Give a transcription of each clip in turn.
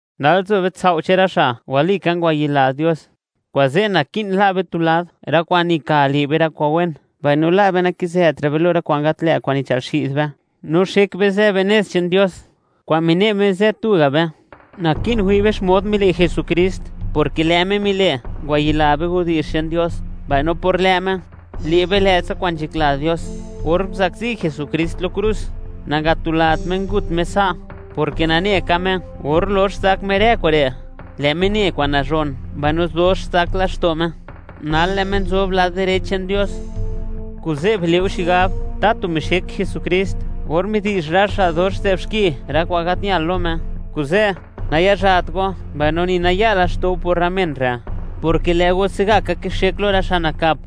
Nal nzo be sao' che'n rë xa' walika ngwayila Dios. Kuze', naki'n la' be tu lad rë kwa'n nika le' be rë kwa'n wen, mbaino la' be nakizëtra' be lo rë kwa'n gat lë' kwa'n nichël xi'd be, no xek be zë be nez che'n Dios kwa'n mine' Me zë tuga' be. Naki'n wi' be xmod mile' Jesukrist, porke lë' Me mile', ngwayila be widi'zh che'n Dios, mbaino por lë' Me, le' be lë'tsa kwa'n nzhakla Dios. Or nguzakzi Jesukrist lo krus, nangatulat Me ngut Me sa', porke nane ka Me, or lox zak Me rë kure', lë' Me ne kwa'n nazhon, mbaino dox zak laxto' Me. Nal lë' Me nzob lad direch che'n Dios. Kuze', bile' go xigab, tatu mixek Jesukrist or midi'zh rë xa' dox nzë'b xki, rë kwa'n gat ñal lo Me. Kuze', nayazhat go mbaino ni naya laxto' go por rë men re', porke lë' go se'gaka kixek lo rë xa' nakap,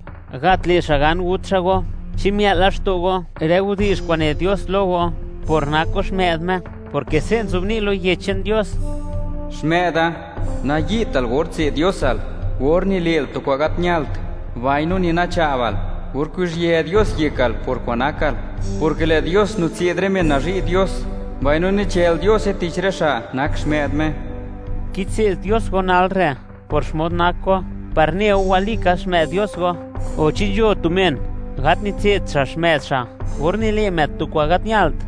gat le' xa' gan gut xa' go. ¿Chi mia'l laxto' go rë widi'zh kwa'n ne Dios lo go por nak go xmë'd Me? Porke se' nzobni' lo Yech che'n Dios: Xmë'da, nayi'tal or tse'd Diosal or nile'l kwa'n gat ñalt, mbaino ni nacha'bal or kuzhië Dios yekal por kwa'n nakal, porke lë' Dios nitse'd rë men nazhi' Dios, mbaino nichël Diose tich rë xa' nak xmë'd Me. Kitse'd Dios go nal re' por xmod nak go, par neu, walika xmë'd Dios go. O, ¿chi nzho tu men gat nitse'd xa' xmë'd xa' or nile' më'd tu kwa'n gat ñalt?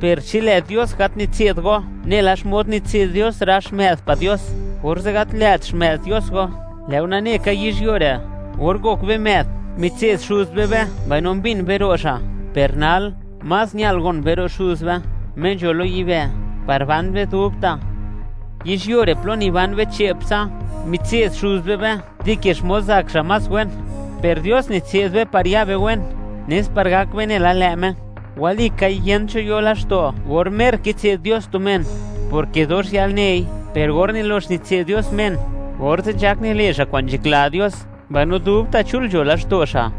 Per chi lë' Dios gat nitse'd go nela xmod nitse'd Dios rë xmë'd pa' Dios, orze' gat lë't xmë'd Dios go. Lë' go nane ka, yizhyuo re', or ngok be më'd, mitse'd xuz be be mbaino mbin be ro' xa'. Per nal, más ñal gon be ro' Xuz be Me nzho lo yibë', par ban be dubta'. Yizhyuo re', plo niban be che'ptsa, mitse'd xuz be be dike xmod zak xa' más wen. Per Dios nitse'd be par ya be wen, nes par gak be nela lë' Me. Walikai, yent cho yo laxto' or mer kitse'd Dios tu men, porke dox yalnei. Per or nilox nitse'd Dios men, orze' nzhak nile' xa' kwa'n nzhakla Dios, mbaino dubta' chul nzho laxto' xa'.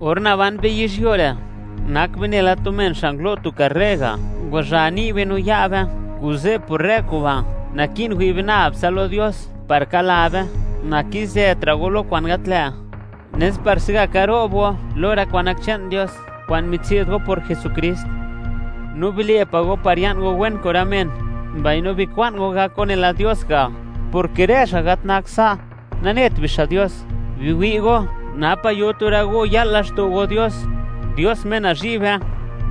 Or naban be yizhyuo re', nak be nela tu men xa' ngulo' tu karre ga', ngwazha ni' be no ya' be. Kuze' por rë kuba', naki'n wi' be nab tsa lo Dios par ka'la be. Nakizëtra' go lo kwa'n gat lë', nes par se'gaka ro'b go lo rë kwa'n nak che'n Dios kwa'n mitse'd go por Jesukrist. No bile' pa' go par ya'n go wen kun rë men, mbaino bikwa'n go gak nela Dios ga', porke rë xa' gat nakt sa', nanet bixa' Dios. Biwi' go napa' yo tu rë go ya'l laxto' go Dios, Dios Me nazhi' be.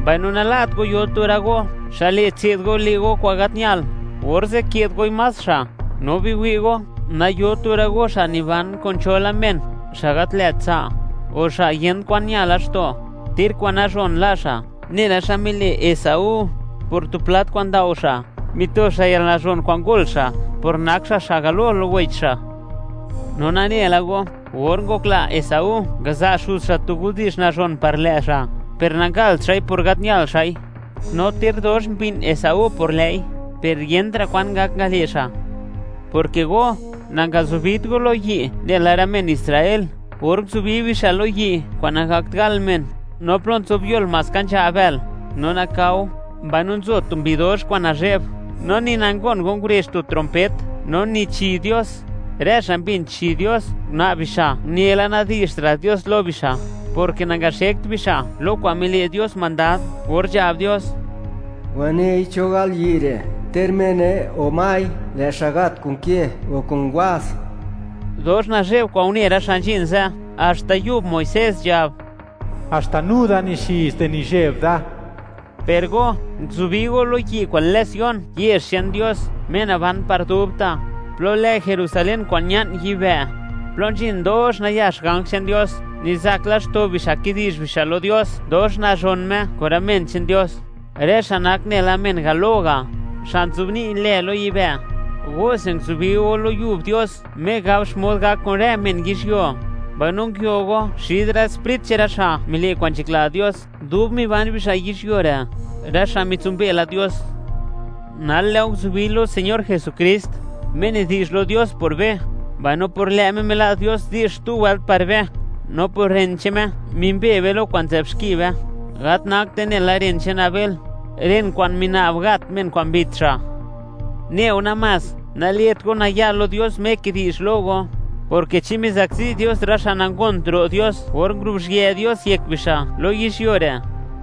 Mbaino nala't go yo tu rë go xa' le' tse'd go le' go kwa'n gat ñal, orze' ke'd goi más xa'. No biwi' go, nayo tu rë go xa' niban kun cho la men, xa' gat lë't tsa', o xa' kwa'n yent kwan ña laxto', ter kwa'n nazhon la' xa', nela xa mile' Esaú. Por tu plat kwa'n ndao xa', mito xa' yalnazhon kwa'n ngol xa', por nak xa', xa' galo lo wech xa'. No nane la go, or ngokla Esaú ngaza' xuz xa' tu widi'zh nazhon par lë' xa', per nangalt xa'i por gat ñal xa'i; no ter dox mbi'n Esaú por lë'i, per yentra' kwan ngak ngale' xa'. Porke go, nangazubit go lo yi' nela rë men Israel, or nguzubi bixa' lo yi' kwa'n nagakt gal men, no plo nzobyol, maska nzha' bël, no nakao, mbaino nzo tu mbi dox kwa'n nazhe'b. No ni nangon go ngurezh tu trompet, no ni chi Dios. Rë xa' mbin chi Dios, una'b bixa', une la nadi'zhtra' Dios lo bixa', porke nangaxekt bixa' lo kwa'n mile' Dios mandad or nzhab Dios: “Wanei cho gal yi' re', ter mene o mai, lë' xa' gat kun ke o kun waz.” Dox nazhe'b kwa'n une rë xa' nzhin ze', haxta yub Muisés nzhab: “Haxta nu da nixiz di nizheb da.” Per go nguzubi go lo yi' kwa'n lë Sion, yezh che'n Dios, Me naban par dubta', plo lë Jerusalén kwa'n ña'n yibë', plo nzhin dox nayax ganj che'n Dios, nizak laxto' bixa' kidi'zh bixa' lo Dios dox nazhon Me; kun rë men che'n Dios, rë xa' nak nela men galo ga', xa' nzobni' lë lo yibë'. Gose nguzubi go lo Yub Dios Me gab xmod gak kun rë men yizhyuo; mbaino nguio go xid rë sprit che'n rë xa' mile' kwa'n nzhakla Dios dub miban bixa' yizhyuo re', rë xa' mitsimbe la Dios. Nal, lë' go nguzubi lo Señor Jesukrist, Me nidi'zh lo Dios por be, mbaino por lë' Me mila' Dios di'zh xtu wëlt par be, no por ren che'n Me, mimbe be lo kwa'n nzë'b xki be; gat nakte nela ren che'n Abel, ren kwa'n mina'b gat men kwa'n mbit xa'. Neu namás, nale't go naya' lo Dios Me kidi'zh lo go, porke chi mizakzi Dios rë xa' nangont ro' Dios or nguruzhië Dios yek bixa' lo yizhyuo re',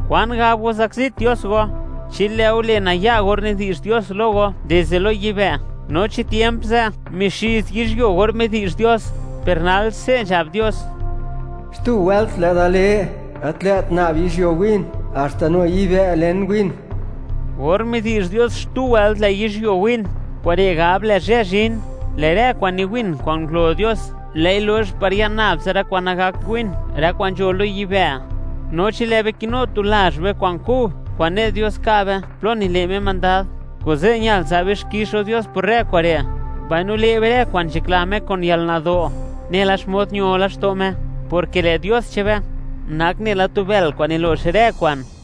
¿kwan gab go zakzit Dios go, chi lë' go le' naya' or nidi'zh Dios lo go dizde lo yibë'? No chi tiemp ze' mixiz yizhyuo or midi'zh Dios, per nal, se' nzhab Dios: Xtu wëlt, lë' Da le, gat lë't nab yizhyuo win, haxta nu yibë' len win. Or midi'zh Dios, xtu wëlt lë' yizhyuo win, kure' gab, lë' zhë zhin, lë' rë kwa'n niwin kwa'n ngulo Dios; lë'i lox par ya'n nab tsa rë kwa'n nagakt win, rë kwa'n nzho lo yibë'. No chi lë' be kinu tu lazh be kwa'n kub, kwa'n ne' Dios yo be plo nile' Me mandad, kuze' ñal za' be xkix lo Dios por rë kure', mbaino le' be rë kwa'n nzhakla Me kun yalnado', nela xmod ño laxto' Me, porke lë' Dios che'n be nak nela tu bël kwa'n nilo'x rë kwa'n.